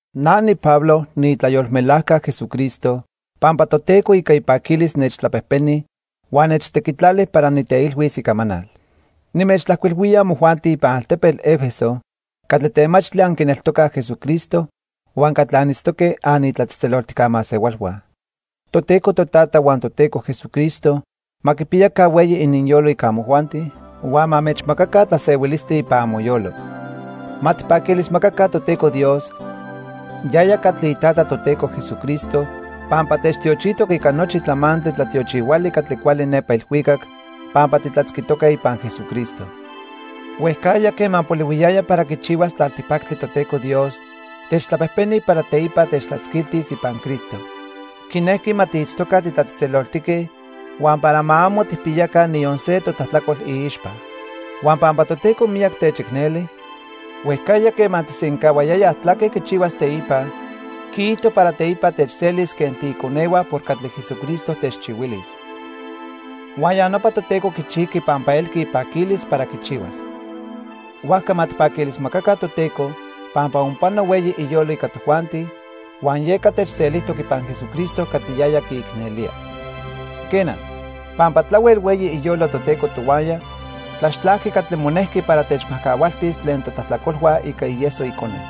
Na niPablo niitlayolmelajca Jesucristo pampa Toteco ica ipaquilis nechtlapejpeni huan nechtequitlali para niteilhuis icamanal. Nimechtlajcuilhuía amojuanti ipan altepetl 'Efeso catli temachtli anquineltocaj Jesucristo huan catli anitztoque anitlatzejtzeloltijca masehualhua. Toteco Totata huan Toteco Jesucristo ma quipiyaca hueyi ininyolo ica amojuanti, huan ma anmechmacaca tlasehuilistli ipan amoyolo. Ma tijpaquilismacaca Toteco Dios, yaya catli iTata Toteco Jesucristo, pampa techtiochijtoc ica nochi tlamantli tlatiochihuali catli cuali nepa ilhuicac pampa titlatzquitoque ipan Jesucristo. Huejcajya quema polihuiyaya para quichihuas tlaltipactli Toteco Dios techtlapejpeni para teipa techtlatzquiltis ipan Cristo. Quinejqui ma tiitztoca titlatzejtzeloltique huan para ma amo tijpiyaca niyon se totlajtlacol iixpa. Huan pampa Toteco miyac techicneli, huejcajya quema quisencahuayaya tlaque quichihuas teipa, quiijto para teipa techselis quen tiiconehua por catli Jesucristo techchihuilis. Huan ya nopa Toteco quichijqui pampa elqui ipaquilis para quichihuas. Huajca ma tijpaquilismacaca Toteco pampa onpano hueyi iyolo ica tojuanti huan yeca techselijtoc ipan Jesucristo catli yaya quiicnelía. Quena, pampa tlahuel hueyi iyolo Toteco tohuaya, tlaxtlajqui catli monejqui para techmajcahualtis tlen totlajtlacolhua ica ieso Icone.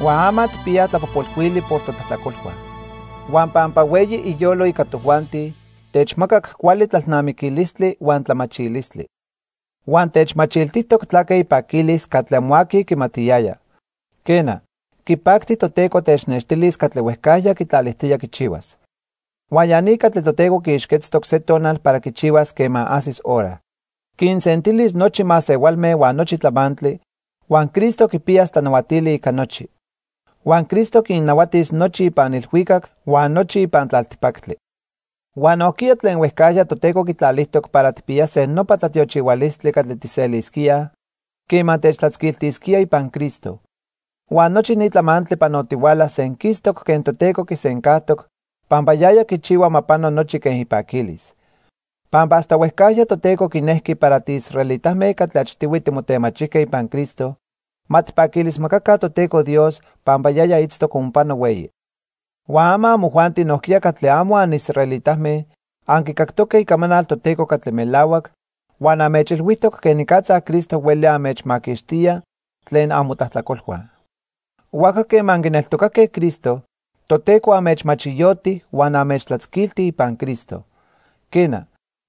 Huan ama tijpiyaj tlapojpolhuili por totlajtlacolhua. Huan pampa hueyi iyolo ica tojuanti techmacac cuali tlalnamiquilistli huan tlamachilistli. Huan techmachiltijtoc tlaque ipaquilis catli amo aqui quimatiyaya. Quena, quipacti Toteco technextilis catli huejcajya quitlalijtoya quichihuas. Huan ya ni catli Toteco quiixquetztoc se tonal para quichihuas quema ajsis hora. Quinsentilis nochi masehualme huan nochi tlamantli, huan Cristo quipiyas tlanahuatili ica nochi. Huan Cristo quinnahuatis nochi ipan ilhuicac huan nochi ipan tlaltipactli. Huan nojquiya tlen huejcajya Toteco quitlalijtoc para tijpiyase nopa tlatiochihualistli catli tijselisquíaj quema techtlatzquiltisquía ipan Cristo. Huan nochi ni tlamantli panotihuala senquistoc quen Toteco quisencajtoc pampa yaya quichihua ma pano nochi quen ipaquilis. Pampa hasta huejcajya Toteco quinejqui para tiisraelitame catli achtihui timotemachijque ipan Cristo, ma tijpaquilismacaca Toteco Dios pampa yaya itztoc onpano hueyi. Huan ama amojuanti nojquiya catli amo anisraelitame anquicactoque icamanal Toteco catli melahuac huan anmechilhuijtoc quenicatza Cristo hueli anmechmaquixtía tlen amotlajtlacolhua. Huajca quema anquineltocaque Cristo, Toteco anmechmachiyoti huan anmechtlatzquilti ipan Cristo. Quena,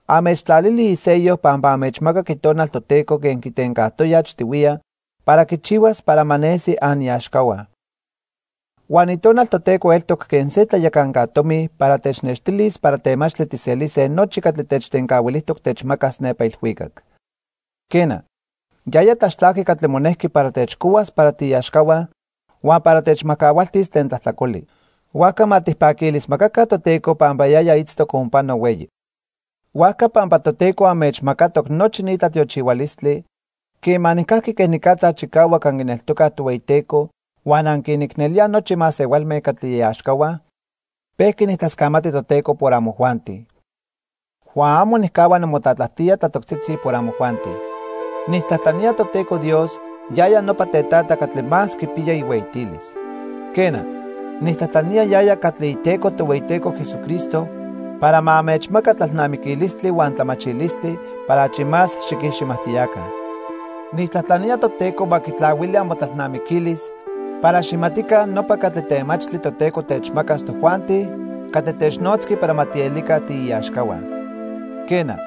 anmechtlalili isello pampa anmechmacac Itonal Toteco quen quitencajtoya achtihuiya para quichihuas para ma nesi aniaxcahua. Huan Itonal Toteco eltoc quen se tlayacanca tomi para technextilis para temachtli tijselise nochi catli techtencahuilijtoc techmacas nepa ilhuicac. Quena, yaya tlaxtlajqui catli monejqui para techcohuas para tiiaxcahua huan para techmajcahualtis tlen tlajtlacoli. Huajca ma tijpaquilismacaca Toteco pampa yaya itztoc onpano hueyi. Huajca pampa Toteco anmechmacatoc nochi ni tlatiochihualistli, quema nijcajqui quenicatza chicahuac anquineltocaj Tohueyiteco huan anquinicnelíaj nochi masehualme catli iaxcahua, pejqui nijtlascamati Toteco por amojuanti. Huan amo nijcahua nimotlatlajtía tlatoctzitzi por amojuanti. Nijtlajtlanía Toteco Dios, yaya nopa Tetata catli más quipiya ihueyitilis. Quena, nijtlajtlanía yaya catli Iteco Tohueyiteco Jesucristo para ma anmechmaca tlalnamiquilistli huan tlamachilistli para achi más xiquiximajtiyaca. Nijtlajtlanía Toteco ma quitlahuili amotlalnamiquilis para xijmatica nopa catli temachtli Toteco techmacas tojuanti catli technotzqui para ma tielica tiiaxcahua. Quena,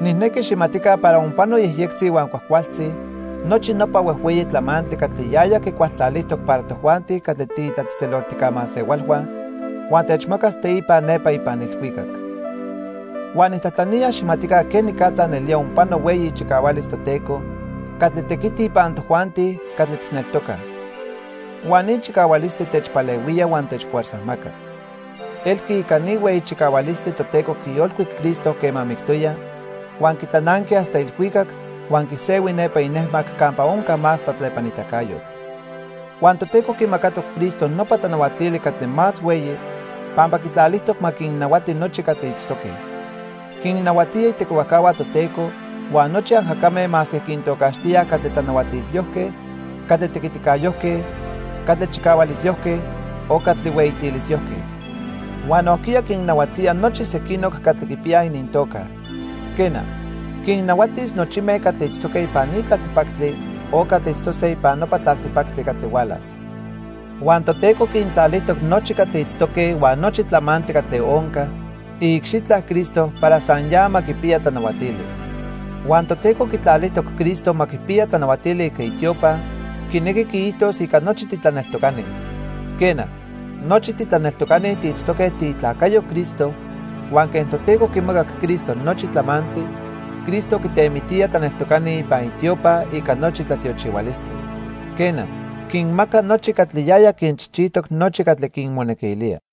nijnequi xijmatica para onpano yejyectzi huan cuajcualtzi nochi nopa huejhueyi tlamantli catli yaya quicualtlalijtoc para tojuanti catli tiitlatzejtzeloltijca masehualhua huan techmacas teipa nepa ipan ilhuicac. Huan nijtlajtlanía xijmatica quenicatza nelía onpano hueyi ichicahualis Toteco catli tequiti ipan tojuanti catli tijneltocaj. Huan ni chicahualistli techpalehuía huan techfuerzajmaca. Elqui ica ni hueyi chicahualistli Toteco quiyolcuic Cristo quema mictoya, huan quitlananqui hasta ilhuicac huan quisehui nepa inejmac campa onca más tlatlepanitacayotl. Huan Toteco quimacatoc Cristo nopa tlanahuatili catli más hueyi pampa quitlalijtoc ma quinnahuati nochi catli itztoque. Quinnahuatía itequihuajcahua Toteco huan nochi ajacame masque quintocaxtíaj catli tlanahuatilyojque, catli tequiticayojque, catli chicahualisyojque o catli hueyitilisyojque. Huan nojquiya quinnahuatía nochi sequinoc catli quipiyaj inintoca. Quena, quinnahuatis nochime catli itztoque ipan ni tlaltipactli o catli itztose ipan nopa tlaltipactli catli hualas. Huan Toteco quintlalijtoc nochi catli itztoque huan nochi tlamantli catli onca iicxitla Cristo para san ya ma quipiya tlanahuatili. Huan Toteco quitlalijtoc Cristo ma quipiya tlanahuatili ica itiopa, quinequi quiijtos ica nochi titlaneltocani. Quena, nochi titlaneltocani tiitztoque tiitlacayo Cristo huan quen Toteco quimacac Cristo nochi tlamantli, Cristo quitemitía tlaneltocani ipan itiopa ica nochi tlatiochihualistli. Quena, quinmaca nochi catli yaya quinchijchijtoc nochi catli quinmonequilía.